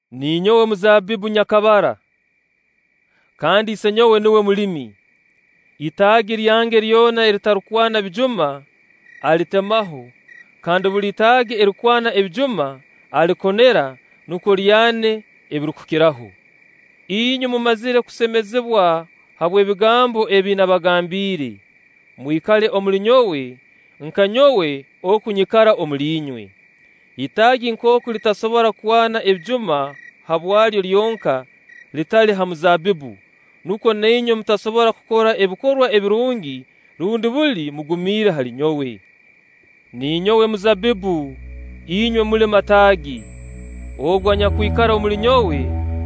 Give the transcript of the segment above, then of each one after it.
Ninyowe muzaabbibbu nyakabara, kandi Isenyowe nuwe mulimi. itaagi lyange lyona eritarukwana bijuma, alitemaho; kandi buli itaagi erirukwana ebijuma alikonera, nukwo lyane ebirukukiraho. Inywe mumazire kusemezibwa habw'ebigambo ebi nabagambiire. Mwikale omuli nyowe, nka nyowe oku nyikara omuli inywe. Itaagi nkooku litasobora kwana ebijuma habwalyo lyonka, litali ha mizaabbibbu, nukwo na inywe mutasobora kukora ebikorwa ebirungi, rundi buli mugumiire hali nyowe. Ninyowe muzaabbibbu, inywe muli mataagi. Ogu anyakwikara omuli nyowe,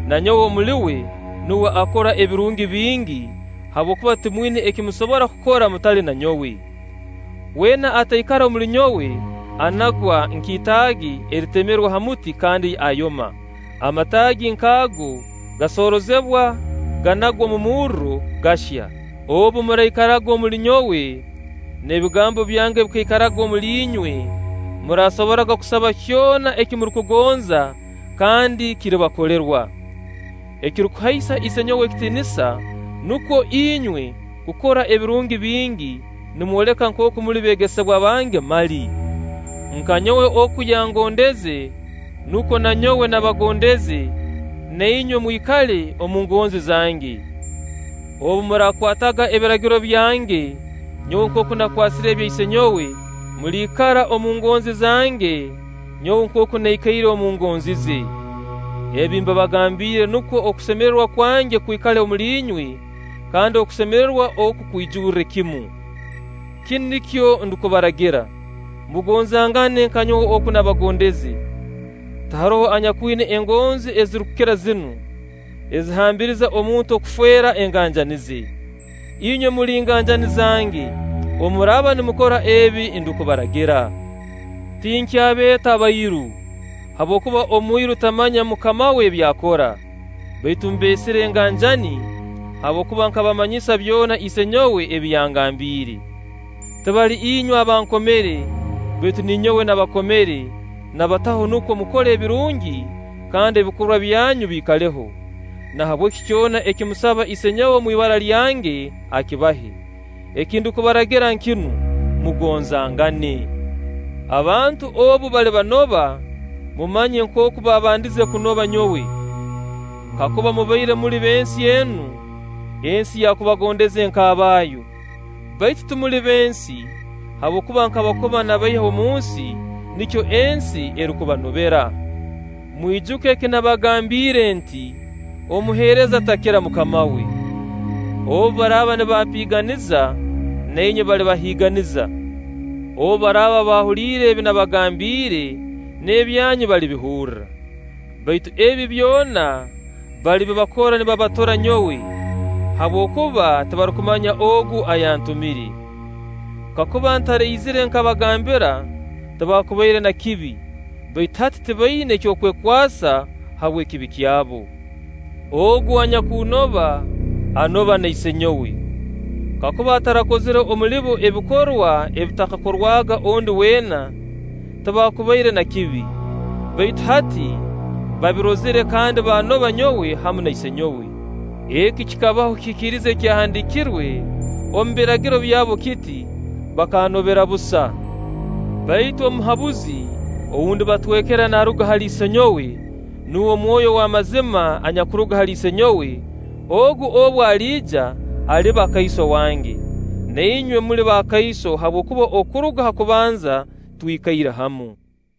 na nyowe omuli uwe, nuwe akora ebirungi bingi; habwokuba timwina eki musobora kukora mutali na nyowe. Weena ataikara omuli nyowe anagwa nk'itaagi eritemerwe ha muti kandi ayoma. Amataagi nk'ago gasoroozebwa, ganagwa omu murro, gahya. Obu muraikaraga omuli nyowe, n'ebigambo byange bikaikara omuli inywe, muraasobora kusaba kyona eki murukugonza, kandi kiribakolerwa. Ekirukuhaisa Isenyowe ekitiinisa nukwo inywe kukora ebirungi bingi, nimwoleka nkooku muli beegesebwa bange mali. Nka nyowe oku yangondeze, nukwo na nyowe nabagondeze; na inywe mwikale omu ngonzi zange. Obu muraakwataga ebiragiro byange nyowe nkooku nakwasire ebya Isenyowe, muliikara omu ngonzi zange nyowe nkooku naikaire omu ngonzi ze. Ebi mbibagambiire nukwo okusemererwa kwange kwikale omuli inywe, kandi okusemererwa oku kwijurre kimu. “Kinu nikyo ndukubaragira: Mugonzangane nka nyowe oku nabagondeze. Tiharoho anyakwina engonzi ezirukukira zinu, ezihambiriza omuntu kufeera enganjani ze. Inywe muli nganjani zange obu muraaba nimukora ebi ndukubaragira. Tinkyabeeta bairu, habwokuba omwiru tamanya mukama we ebi akora; baitu mbeesire nganjani, habwokuba nkabamanyisa byona Isenyowe ebi yangambiire. Tibali inywe abankomere, baitu ninyowe nabakomere, nabataho nukwo mukole ebirungi, kandi ebikorwa byanyu biikaleho. Nahabweki kyona eki musaba Isenyowe omu ibara lyange, akibahe. Eki ndukubaragira nkinu: Mugonzangane.” “Abantu obu balibanoba, mumanye nkooku baabandize kunoba nyowe. Kakuba mubaire muli b'ensi enu, ensi yakubagondeze nk'abaayo; baitu timuli b'ensi habwokuba nkabakoma nabaiha omunsi, nikyo ensi erukubanobera. Mwijuke eki nabagambiire nti: ‘Omuheereza takira mukama we’. Obu baraaba nibampiiganiza, na inywe balibahiiganiza. Obu baraaba baahuliire ebi nabagambiire, n'ebyanyu balibihurra. Baitu ebi byona balibibakora nibabatura nyowe, habwokuba tibarukumanya Ogu ayantumire. Kakuba ntaraizire nkabagambira, tibaakubaire na kibi; baitu hati tibaina ky'okwekwasa habw'ekibi kyabo. Ogu anyakunnoba, anoba na Isenyowe. kakuba ntarakozire omuli bo ebikorwa ebitakakorwaga ondi weena, tibaakubaire na kibi; baitu hati babirozire kandi baanoba nyowe hamu na Isenyowe. Eki kikabaho kihikirize ekyahandiikirwe omu Biragiro byabo kiti: ‘Bakannobera busa’. Baitu Omuhabuzi ou ndibatwekera, naaruga hali Isenyowe, nuwe Mwoyo ow'amazima anyakuruga hali Isenyowe, Ogu obu aliija aliba kaiso wange. Na inywe muli bakaiso, habwokuba okuruga ha kubanza twikaire hamu.”